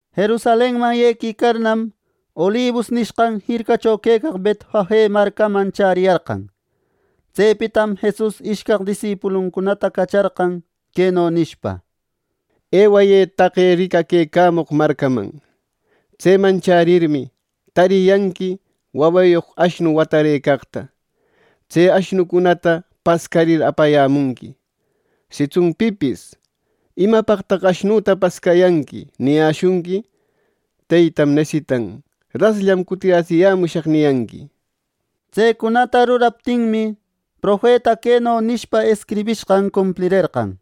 Jerusalenman yequicarnam, Olibus nishqan jircacho quecaq Betfage marcaman chäriyarqan. Tsepitam Jesus ishcaq disipuluncunata cacharqan queno nishpa: —Ewayë taqe ricaquecamoq marcaman. Tseman chärirmi, tariyanqui wawayoq ashnu watarëcaqta. Tse ashnucunata pascarir apayämunqui. Sitsun pipis ‘¿Imapaqtaq ashnuta pascayanqui?’ niyäshunqui, ‘Teytam nesitan. Rasllam cutiratsiyämushaq’ niyanqui. Tsecunata ruraptinmi, profeta queno nishpa escribishqan cumplirerqan: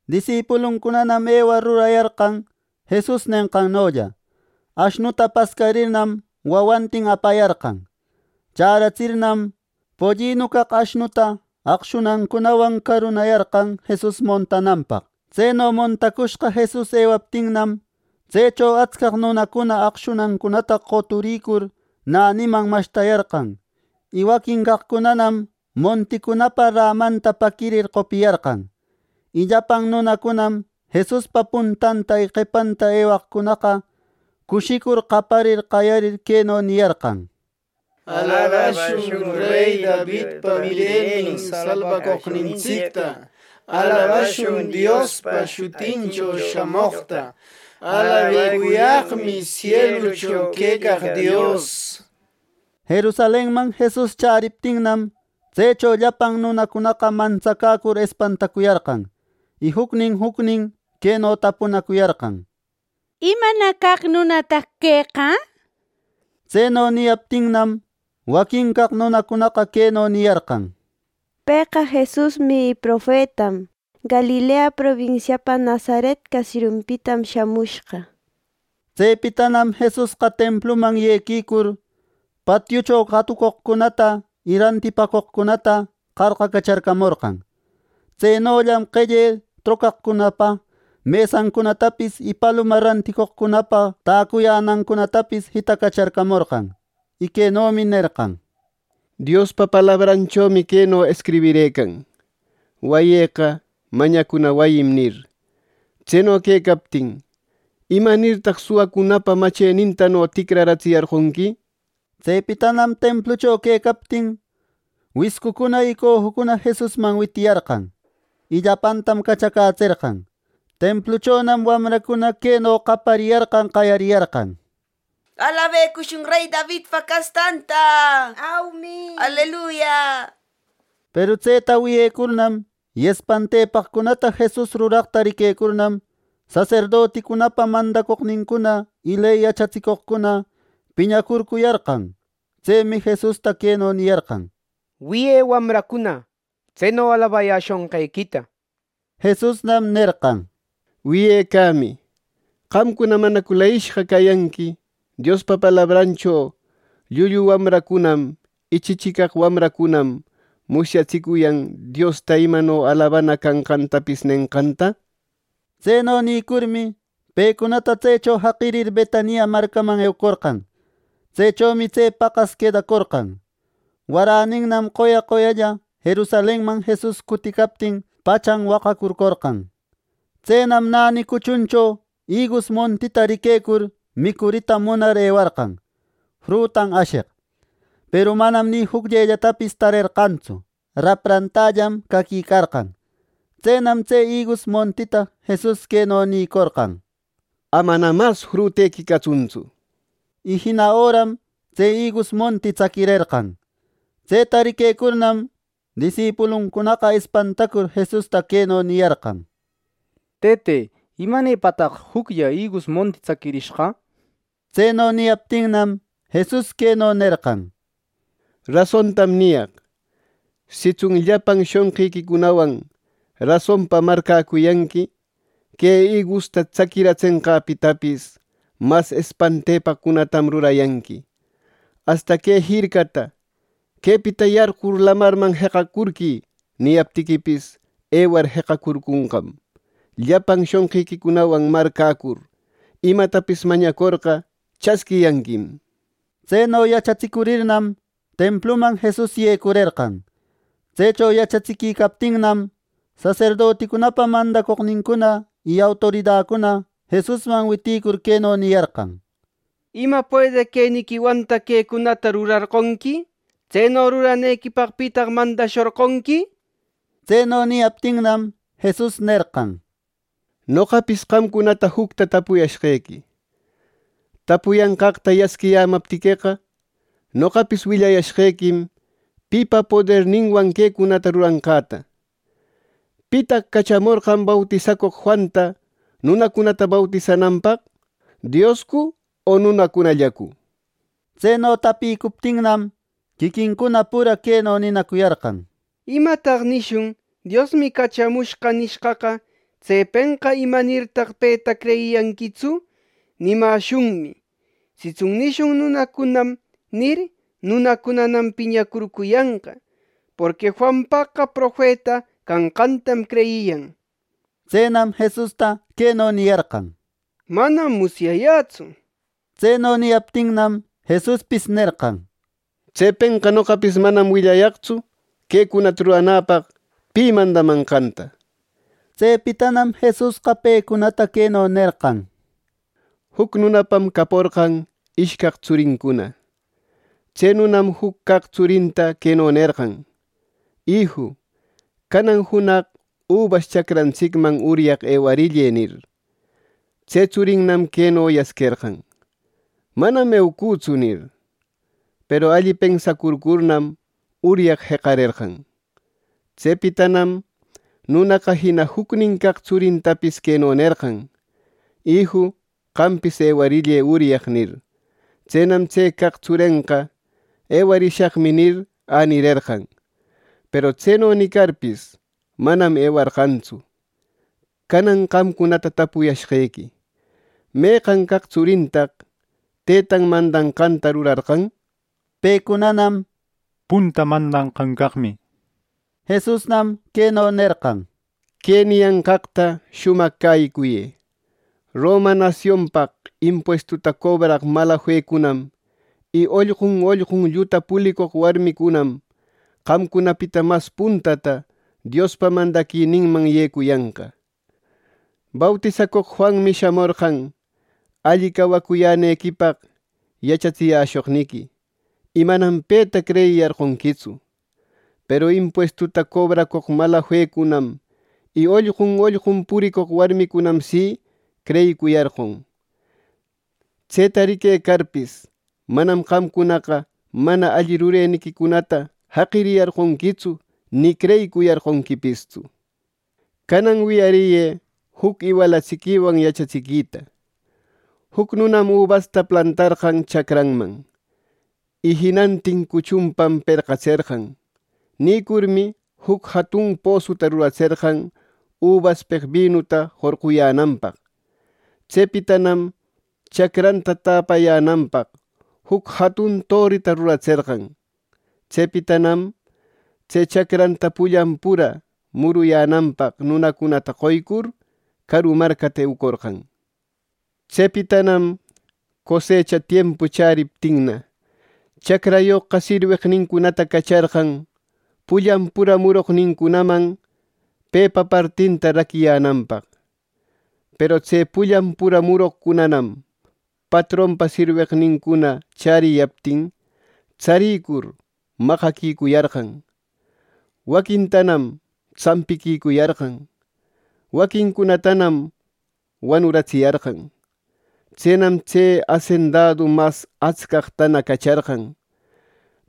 Disipuluncunanam ewar rurayarqan Jesus nenqannolla. Ashnuta pascarirnam, wawantin apayarqan. Chäratsirnam, pollinu caq ashnuta aqshunancunawan carunayarqan Jesus montananpaq. Tseno montacushqa Jesus ewaptinam, tsecho atscaq nunacuna aqshunancunata qoturïcur näniman mashtayarqan; y waquincaqcunanam monticunapa rämanta paquirir qopiyarqan. Y llapan nunacunam Jesuspa puntanta y qepanta ewaqcunaqa, cushicur qaparir qayarir queno niyarqan: —¡Alabashun rey Davidpa mirenin salbacoqnintsicta! ¡Alabashun Diospa shutincho shamoqta! ¡Alabecuyaqmi sielucho quecaq Dios! —nishpa. Jerusalenman Jesus chäriptinnam, tsecho llapan nunacunaqa mantsacäcur espantacuyarqan, y jucnin jucnin queno tapunacuyarqan: —¿Imana caq nunataq queqa! —nir. Tseno niyaptinnam, waquin caq nunacunaqa queno niyarqan: —Pëqa Jesusmi y profetam. Galilea probinsiapa Nazaret caseriunpitam shamushqa —nir. Tsepitanam Jesusqa templuman yequicur, patiucho qatucoqcunata y rantipäcoqcunata qarqacacharcamorqan. Tsenollam qelle trocaqcunapa mesancunatapis y paluma ranticoqcunapa täcuyänancunatapis jitacacharcamorqan. Y quenomi nerqan: —Diospa palabranchomi queno escribirëcan: ‘Wayïqa mañacuna wayim’ nir. Tseno quecaptin, ¿imanirtaq suwacunapa machenintano ticratsiyarqonqui! —nir. Tsepitanam templucho quecaptin wiscucuna y cojucuna Jesusman witiyarqan, y llapantam cachacätserqan. Templuchonam wamracuna queno qapariyarqan qayariyarqan: —¡Alabecushun rey Davidpa castanta! —nir. Peru tseta wiyecurnam, y espantepaqcunata Jesus ruraqta riquecurnam, saserdoticunapa mandacoqnincuna y ley yachatsicoqcuna piñacurcuyarqan. Tsemi Jesusta queno niyarqan: —¡Wiyë wamracuna tseno alabayäshonqequita! —nir. Jesusnam nerqan: —Wiyecamï, ¿qamcuna manacu leyishqa cayanqui Diospa palabrancho: ‘Llullu wamracunam y chichicaq wamracunam musyatsicuyan Diosta imano alabanan canqantapis’ nenqanta! Tseno nïcurmi, pecunata tsecho jaqirir Betania marcaman eucorqan. Tsechomi tse paqas quedacorqan. Waräninnam qoya, qoyalla Jerusalenman Jesus cuticaptin pachan waqacurcorqan. Tsenam näni cuchuncho igus montita riquecur micurita munar ewarqan frutan asheq; peru manam ni jucllellatapis tarerqantsu. Raprantällam caquicarqan. Tsenam tse igus montita Jesus queno nïcorqan: —¡Amana mas frutequi catsuntsu! —nir. Y jina öram tse igus monti tsaquirerqan. Tseta riquecurnam, disipuluncunaqa espantacur Jesusta queno niyarqan: —Tëte, ¿Imanepataq juclla igus monti tsaquirishqa? —nir. Tseno niyaptinnam, Jesus queno nerqan: —Rasontam niyaq: Sitsun llapan shonqiquicunawan rasonpa marcäcuyanqui, que igusta tsaquiratsenqäpitapis mas espantepaqcunatam rurayanqui; asta que jircata ‘¡Quepita yarqur lamarman jeqacurquï!’ niyaptiquipis, ewar jeqacurconqam. Llapan shonqiquicunawan marcäcur imatapis mañacorqa, chasquiyanquim. Tseno yachatsicurirnam, templuman Jesus yecurerqan. Tsecho yachatsiquicaptinnam, saserdoticunapa mandacoqnincuna y autoridacuna Jesusman witïcur queno niyarqan: —¿Ima puedeq queniquiwantaq quecunata rurarqonqui! ¿Tseno ruranequipaq pitaq mandashorqonqui! —nir. Tseno niyaptinnam, Jesus nerqan: —Noqapis qamcunata jucta tapuyäshqequi: Tapuyanqaqta yasquiyämaptiqueqa, noqapis willayäshqequim pipa poderninwan quecunata ruranqäta ¿Pitaq cachamorqan bautisacoq Juanta nunacunata bautisananpaq, Dioscu o nunacunallacu? Tseno tapïcuptinnam, quiquincuna pura queno ninacuyarqan: —¿Imataq nishun? ‘Diosmi cachamushqa’ nishqaqa, tsepenqa ‘¿Imanirtaq peta creyiyarqequitsu!’ nimäshunmi. Sitsun nishun ‘Nunacunam’ nir, nunacunam piñacurcuyanqa. Porqui Juanpaqqa profeta canqantam creyiyan —nir. Tsenam Jesusta queno niyarqan: —Manam musyayätsu —nir. Tseno niyaptinnam, Jesuspis nerqan: —Tsepenqa noqapis manam willayaqtsu quecunata ruranäpaq pi mandamanqanta —nir. Tsepitanam Jesusqa pecunata queno nerqan: —Juc nunapam caporqan ishcaq tsurincuna. Tse nunam juc caq tsurinta queno nerqan: ‘Iju, canan junaq ubas chacrantsicman uryaq ewarillë’ nir. Tse tsurinnam queno yasquerqan: ‘¡Manam eucütsu!’ nir. Peru alli pensacurcurnam, uryaq jeqarerqan. Tsepitanam nunaqa jina jucnin caq tsurintapis queno nerqan: ‘Iju, qampis ewarillë uryaq’ nir. Tsenam tse caq tsurenqa ‘Ewarishaqmi’ nir, änirerqan; peru tseno nicarpis, manam ewarqantsu. Canan qamcunata tapuyashqequi, ¿Meqan caq tsurintaq Tëtan mandashqanta rurarqan? Pecunanam —Punta mandanqan caqmi —niyarqan. Jesusnam queno nerqan: —Que niyanqaqta shumaq cäyicuyë: Roma nasionpaq impuestuta cobraq malafecunam y ollqun ollqun lluta pulicoq warmicunam qamcunapita mas puntata Diospa mandaquininman yecuyanqa. Bautisacoq Juanmi shamorqan alli cawacuyänequipaq yachatsiyäshoqniqui, y manam peta creyiyarqonquitsu. Peru impuestu cobracoq malafecunam y ollqun ollqun puricoq warmicunam si creyicuyarqon. Tseta riquecarpis, manam qamcunaqa mana alli rureniquicunata jaqiyarqonquitsu, ni creyicuyarqonquipistsu. “Canan wiyariyë juc iwalatsiquiwan yachatsiquita: Juc nunam ubasta plantarqan chacranman, y jinantin cuchunpa perqatserqan. Nïcurmi, juc jatun posuta ruratserqan ubaspeq binuta jorquyänanpaq. Tsepitanam chacranta täpayänanpaqna juc jatun torita ruratserqan. Tsepitanam tse chacranta pullan pura muruyänanpaq nunacunata qoquicur, caru marcapa eucorqan. Tsepitanam cosecha tiempu chäriptinna, chacrayoqqa sirweqnincunata cacharqan pullan pura muroqnincunaman pepa partinta raquiyänanpaq. Peru tse pullan pura muroqcunanam patronpa sirweqnincuna chäriyaptin, tsarïcur maqaquicuyarqan, waquintanam tsampiquicuyarqan, waqincunatanam wanuratsiyarqan. Tsenam tse asendadu mas atscaqtana cacharqan;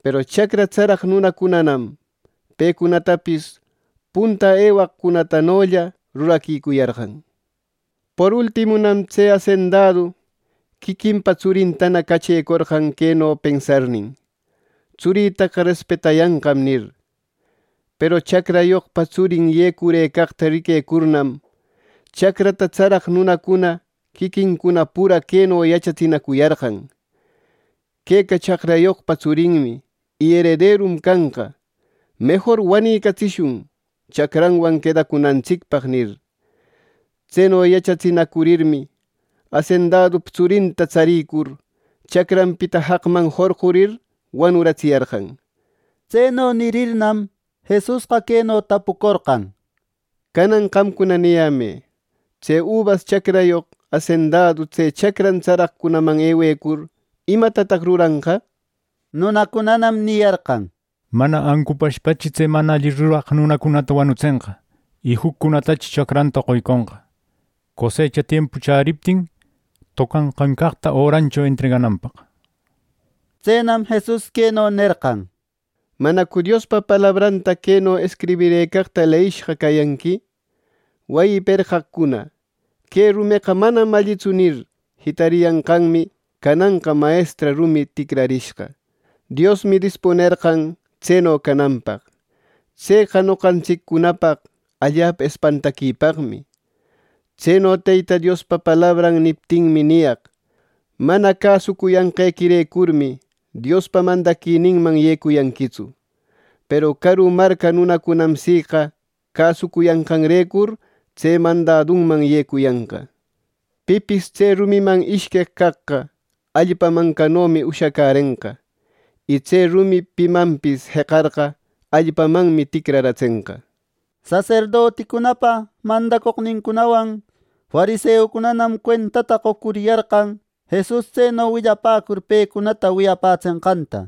peru chacra tsaraq nunacunanam pecunatapis punta ewaqcunatanolla ruraquicuyarqan. “Por ultimunam tse asendadu quiquinpa tsurintana cachecorqan queno pensarnin: ‘Tsurïtaqa respetayanqam’ nir. Peru chacrayoqpa tsurin yecurëcaqta riquecurnam, chacra tsaraq nunacuna quiquincuna pura queno yachatsinacuriyarqan: ‘Queqa chacrayoqpa tsurinmi y erederum canqa; mejor wanicatsishun chacranwan quedacunantsicpaq’ nir. Tseno yachatsinacurirmi, asendadupa tsurinta tsarïcur, chacranpita jaqman jorqurir wanuratsiyarqan.” Tseno nirirnam, Jesusqa queno tapucorqan: —Canan qamcuna niyämë: Tse ubas chacrayoq asendadu tse chacran tsaraqcunaman ewecur, ¿Imatataq ruranqa? Nunacunanam niyarqan: —Mana ancupashpachi tse mana alli ruraq nunacunata wanutsenqa. Y juccunatanachi chacranta qoyconqa, cosecha tiempu chäriptin tocanqan caqta örancho entregayänapaq. Tsenam Jesus queno nerqan: —¿Manacu Diospa palabranta queno escribirëcaqta leyishqa cayanqui? ‘Wayi perqaqcuna: “Que rumeqa manam allitsu” nir, jitariyanqanmi, cananqa mayestra rumi ticrarishqa. Diosmi dispunerqan tseno cananpaq. Tseqa noqantsiccunapaq allapa espantaquipaqmi’ Tseno Teyta Diospa palabran niptinmi niyaq: Mana cäsucuyanqequirecurmi, Diospa mandaquininman yecuyanquitsu; peru caru marca nunacunam siqa, cäsucuyänqanrecur tse mandadunman yecuyanqa. Pipis tse rumiman ishqueq caqqa, allpa mancanomi ushacärenqa. Y tse rumi pimanpis jeqarqa, allpamanmi ticraratsenqa. Saserdoticunapa mandacoqnincunawan fariseucunanam cuentata qoquicuyarqan Jesus tseno willapäcur pecunata wiyapätsenqanta.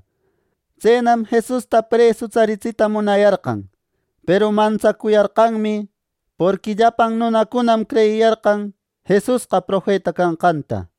Tsenam Jesusta presu tsaritsita munayarqan, peru mantsacuyarqanmi; porqui llapan nunacunam creyiyarqan Jesusqa profeta canqanta.